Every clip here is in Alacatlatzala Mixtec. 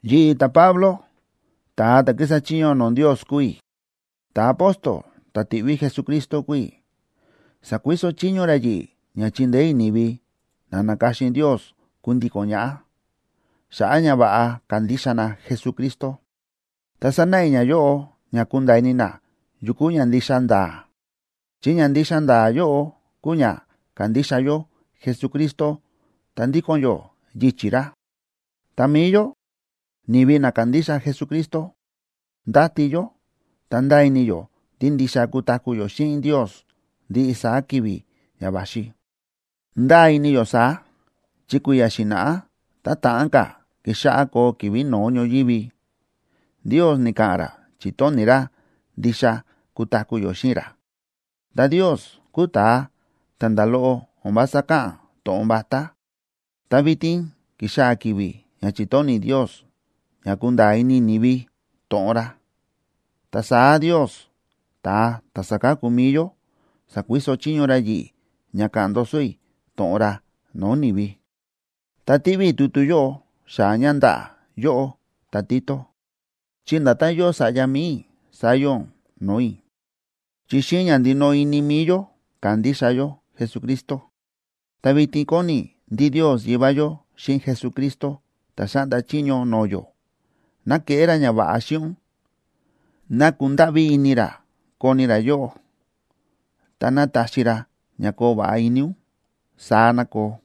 Yi̱ꞌi̱, ta̱Pablo, ta̱a ta̱ kísa chiño no̱o̱ Ndios kúu i̱, ta̱apóstol ta̱ ti̱ꞌví Jesucristo kúu i̱. Sa̱kuiso chiño ra yi̱ꞌi̱ ña chindeé i̱ ni̱vi na na̱ka̱xin Ndios kundíko̱n ñaꞌá, xa̱ꞌa̱ ña va̱ꞌa kandixa na Jesucristo. Ta sánáꞌa i̱ nayóꞌo ña kunda̱a̱ ini na yu kúu ña ndixa nda̱a̱, chi ña ndixa nda̱a̱ yóꞌo kúu ña kándixa yó Jesucristo ta ndíko̱n yó yichi̱ ra. Ta mi̱i yó, ni̱vi na kándixa Jesucristo, ndáti yó ta ndáa ini yó ndí ndixa kutaku̱ yó xíꞌin Ndios ndiꞌi saá ki̱vi̱ ña va̱xi. Ndáa ini yó saá chi kui̱ya̱ xi̱na̱ꞌá, tá ta̱ꞌán ka̱ kixáꞌá koo ki̱vi̱ no̱ó ñoyívi, Ndios ni̱ka̱ꞌa̱n ra chi̱tóni̱ ra ndixa kutaku̱ yó xíꞌin ra. Ta Ndios kúu ta̱a ta̱ nda̱ loꞌo o̱n vása káꞌa̱n to̱ꞌon vatá. Ta vitin ki̱xaa̱ ki̱vi̱ ña chi̱tóni̱ Ndios ña kunda̱a̱ ini ni̱vi to̱ꞌon ra. Ta saá Ndios, ta̱a ta̱ sáka̱ku mi̱i yó, sa̱kuiso chiño ra yi̱ꞌi̱ ña ka̱ꞌa̱n ndoso i̱ to̱ꞌon ra no̱o̱ ni̱vi. Ta tíꞌví i̱ tutu yóꞌo xaa̱ ña ndaꞌa̱ yóꞌó ta̱Tito, chi nda̱tán yóo sa̱ꞌya mi̱i i̱ saá yóo ún no̱o̱ i̱, chi xíꞌin ña ndinoꞌo ini mi̱i yó kándixa yó Jesucristo. Ta vitin kóni i̱ ndí Ndios Yivá yó xíꞌin Jesucristo ta̱ xáꞌnda chiño no̱o̱ yó, ná keꞌé ra ñava̱ꞌa xíꞌin ún, ná kundáꞌví ini ra koni ra yóꞌó, ta ná taxi ra ña koo va̱ꞌa ini ún. Saá ná koo.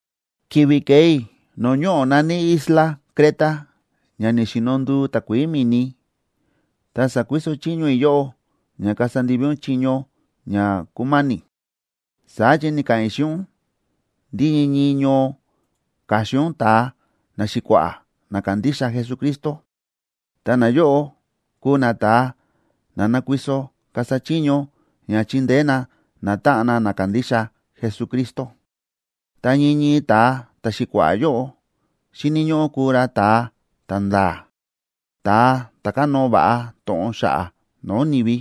Ki̱vi̱ ke̱e i̱ no̱o̱ ñoꞌo̱ na̱ní isla Creta ña ni̱xino nduu takuií mi̱ni, ta sa̱kuiso chiño i̱ yóꞌó, ña kasa ndivi ún chiño ña kúma̱ni̱. Saá chi ni̱ka̱ꞌa̱n i̱ xíꞌin ún ndí ñii ñii ñoo ka̱xin ún ta̱a naxi̱kua̱ꞌa̱ na kándixa Jesucristo, ta nayóꞌo kuu nata̱a na nakuiso kasa chiño ña chindeé na natáꞌan na na kándixa Jesucristo. Ta ñii ñii ta̱a ta̱xi̱kua̱ꞌa̱ yóꞌo xíni̱ ñóꞌó kuu ra ta̱a ta̱nda̱a̱, ta̱a ta̱ kánóo va̱ꞌa to̱ꞌon xa̱ꞌa̱ no̱o̱ ni̱vi.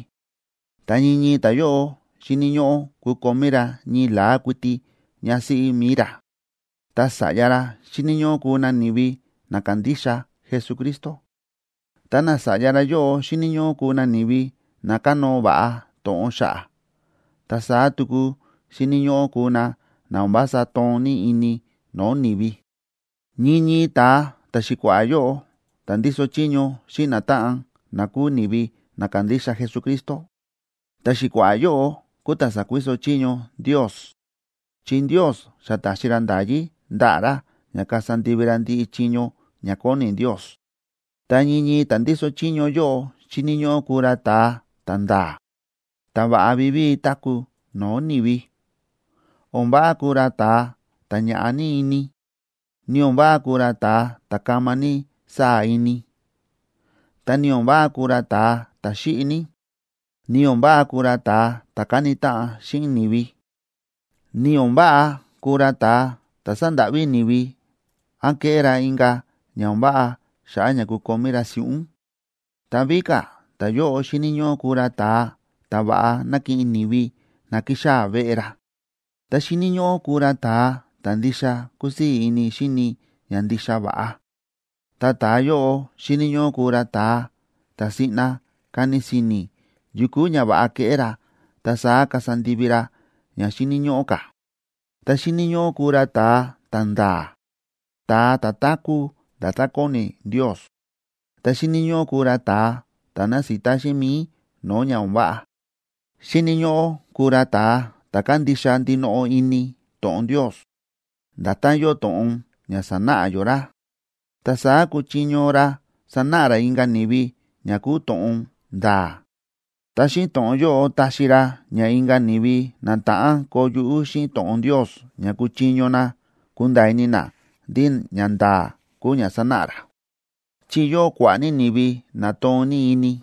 Ta ñii ñii ta̱yóꞌo xíni̱ ñóꞌó kukomí ra ñii la̱á kuiti ñásíꞌí mi̱i ra, ta sa̱ꞌya ra xíni̱ ñóꞌó kuu na ni̱vi na kándixa Jesucristo, ta nasa̱ꞌya ra yóꞌo xíni̱ ñóꞌó kuu na ni̱vi na kánóo va̱ꞌa to̱ꞌon xa̱ꞌa̱, ta saá tuku xíni̱ ñóꞌó kuu na na o̱n vása toon ní ini no̱o̱ ni̱vi. Ñii ñii ta̱a ta̱xi̱kua̱ꞌa̱ yóꞌo ta̱ ndíso chiño xíꞌin natáꞌan na kúu ni̱vi na kándixa Jesucristo, ta̱xi̱kua̱ꞌa̱ yóꞌo kúu ta̱ sa̱kuiso chiño Ndios, chi Ndios xa ta̱xi ra nda̱yí ndaꞌa̱ ra ña kasa ndivi ra ndiꞌi chiño ña kóni Ndios. Ta ñii ñii ta̱ ndíso chiño yóꞌo xíni̱ ñóꞌó kuu ra ta̱a ta̱nda̱a̱, ta̱ va̱ꞌa vivíi táku̱ no̱o̱ ni̱vi. O̱n váꞌa kuu ra ta̱a ta̱ ñaꞌá ní ini, ni o̱n váꞌa kuu ra ta̱a ta̱ kama ní sáa̱ ini, ta ni o̱n váꞌa kuu ra ta̱a ta̱ xíꞌi ní, ni o̱n váꞌa kuu ra ta̱a ta̱ káni táꞌan xíꞌin ni̱vi, ni o̱n váꞌa kuu ra ta̱a ta̱ sándáꞌví ni̱vi án kéꞌé ra inka̱ ña o̱n váꞌa xa̱ꞌa̱ ña kukomí ra si̱ꞌún. Ta víka̱ ta̱yóꞌo xíni̱ ñóꞌó kuu ra ta̱a ta̱ va̱ꞌa nákiꞌin ni̱vi na kíxaa̱ veꞌe ra. Ta xíni̱ ñóꞌó kuu ra ta̱a ta̱ ndixa kúsii̱ ini xíni ña ndixa va̱ꞌa, ta ta̱a yóꞌo xíni̱ ñóꞌó kuu ra ta̱a ta̱ siꞌna kani si̱ni̱ yu kuu ña va̱ꞌa keꞌé ra, ta saá kasa ndivi ra ña xíni̱ ñóꞌó ka̱. Ta xíni̱ ñóꞌó kuu ra ta̱a ta̱nda̱a̱, ta̱a ta̱ táku̱ nda̱tán kóni Ndios. Ta xíni̱ ñóꞌó kuu ra ta̱a ta̱ násita xíꞌin mi̱i no̱o̱ ña o̱n váꞌa. Xíni̱ ñóꞌó kuu ra ta̱a ta̱ kándixa ndinoꞌo ini to̱ꞌon Ndios, nda̱tán yóo to̱ꞌon ña sa̱náꞌa yó ra. Ta saá kuchiño ra sanáꞌa ra inka̱ ni̱vi ña kúu to̱ꞌon nda̱a̱, ta xíꞌin to̱ꞌon yóꞌo táxi ra ña inka̱ ni̱vi na ta̱ꞌán koo yuꞌú xíꞌin to̱ꞌon Ndios ña kúchiño na kunda̱a̱ ini na ndí ñanda̱a̱ kúu ña sánáꞌa ra. Chi yóo kua̱ꞌa̱ ní ni̱vi na toon ní ini,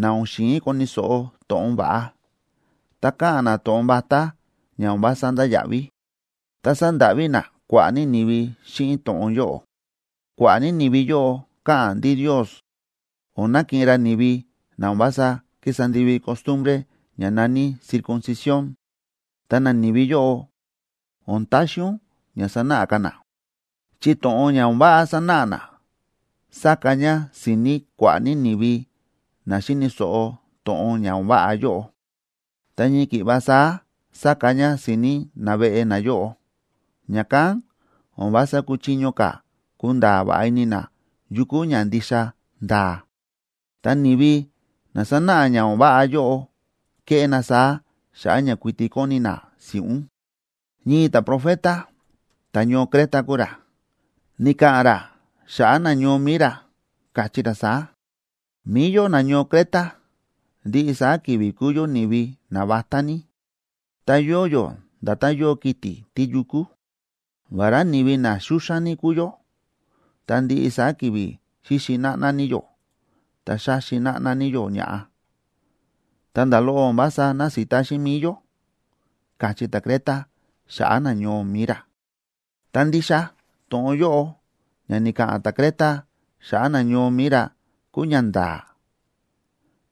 na o̱n xi̱in koni̱ so̱ꞌo to̱ꞌon va̱ꞌa, ta káꞌa̱n na to̱ꞌon vatá ña o̱n vása ndáya̱ꞌví, ta sándáꞌví na kua̱ꞌa̱ ni̱vi xíꞌin to̱ꞌon yóꞌo. Kua̱ꞌa̱ ní ni̱vi yóꞌo káꞌa̱n ndí Ndios o̱n nakiꞌin ra ni̱vi na o̱n vása kísa ndivi costumbre ña na̱ní circuncisión.a Ta nani̱vi yóꞌo, o̱n taxi ún ña sanáꞌa ka̱ na, chi to̱ꞌon ña o̱n váꞌa sánáꞌa na sáka ña si̱ni̱ kua̱ꞌa̱ ní ni̱vi na xi̱ni̱ so̱ꞌo to̱ꞌon ña o̱n váꞌa yóꞌo, ta ñii ki̱ꞌva saá sáka ña si̱ni̱ naveꞌe nayóꞌo, ña̱kán o̱n vása kúchiño ka̱ kunda̱a̱ va̱ꞌa ini na yu kúu ña ndixa nda̱a̱. Ta ni̱vi na sánáꞌa ña o̱n váꞌa yóꞌo kéꞌé na saá xa̱ꞌa̱ ña kuiti kóni na si̱ꞌún. Ñii ta̱profeta, ta̱ñoo Creta kúu ra, ni̱ka̱ꞌa̱n ra xa̱ꞌa̱ nañoo mi̱i ra, káchí ra saá: “Mi̱i yó nañoo Creta, ndiꞌi saá ki̱vi̱ kúu yó ni̱vi navatá ní, ta yóo yó nda̱tán yóo kiti̱ tíyukú. Vará ni̱vi na xúxán ní kúu yó, ta ndiꞌi saá ki̱vi̱ xíxi náꞌná ní yó ta xáxi náꞌná ní yó ña̱ꞌa, ta nda̱ loꞌo o̱n vása násita xíꞌin mi̱i yó”, káchí ta̱Creta xa̱ꞌa̱ nañoo mi̱i ra. Ta ndixa to̱ꞌon yóꞌo ña ni̱ka̱ꞌa̱n ta̱Creta xa̱ꞌa̱ nañoo mi̱i ra kúu ñanda̱a̱.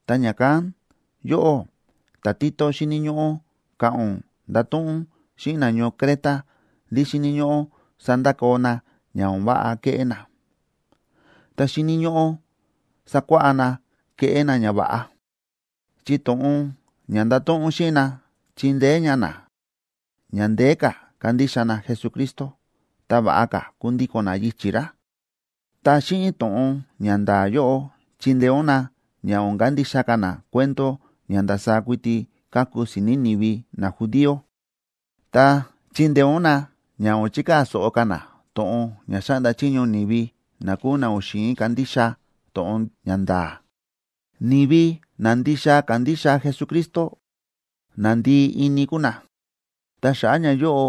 Ta ña̱kán yóꞌó ta̱Tito, xíni̱ ñóꞌó ka̱ꞌa̱n ún ndato̱ꞌon ún xíꞌin nañoo Creta ndí xíni̱ ñóꞌó sandakoo na ña o̱n váꞌa kéꞌé na, ta xíni̱ ñóꞌó sakuáꞌá na keꞌé na ñava̱ꞌa. Chi to̱ꞌon ña ndato̱ꞌon ún xíꞌin na chindeé ña na ña ndeé ka̱ kandixa na Jesucristo ta va̱ꞌa ka̱ kundíko̱n na yichi̱ ra. Ta xíꞌin to̱ꞌon ña nda̱a̱ yóꞌo chindeé ún na ña o̱n kandixa ka̱ na cuento ña ndasaá kuiti káku si̱ni̱ ni̱vi najudío, ta chindeé ún na ña o̱n chikaa̱ so̱ꞌo ka̱ na to̱ꞌon ña xáꞌnda chiño ni̱vi na kúu na o̱n xi̱in kandixa to̱ꞌon ña nda̱a̱. Ni̱vi na ndixa kándixa Jesucristo, na ndii ini kúu na, ta xa̱ꞌa̱ ñayóꞌo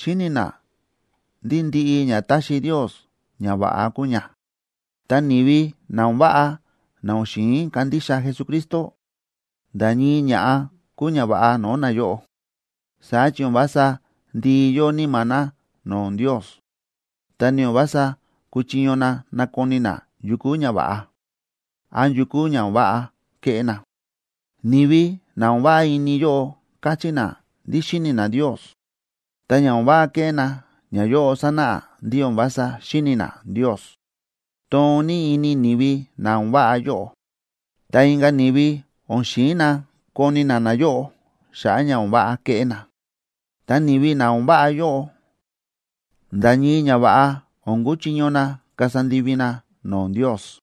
xíni̱ na ndí ndiꞌi ña táxi Ndios, ña va̱ꞌa kúu ña. Ta ni̱vi na o̱n váꞌa na o̱n xi̱in kandixa Jesucristo, nda̱ ñii ña̱ꞌa kúu ña va̱ꞌa no̱o̱ nayóꞌo. Saá chi o̱n vása ndii yóo níma̱ na no̱o̱ Ndios, ta ni o̱n vása kúchiño na nakoni na yu kúu ña va̱ꞌa, án yu kúu ña o̱n váꞌa kéꞌé na. Ni̱vi na o̱n váꞌa ini yóꞌo káchí na ndí xíni̱ na Ndios, ta ña o̱n váꞌa kéꞌé na, ñayóꞌo sánáꞌa ndí o̱n vása xíni̱ na Ndios. Toon ní ini ni̱vi na o̱n váꞌa yóꞌo, ta inka̱ ni̱vi o̱n xi̱in na koni na nayóꞌo xa̱ꞌa̱ ña o̱n váꞌa kéꞌé na. Ta ni̱vi na o̱n váꞌa yóꞌo, nda̱ ñii ñava̱ꞌa o̱n kuchiño na kasa ndivi na no̱o̱ Ndios.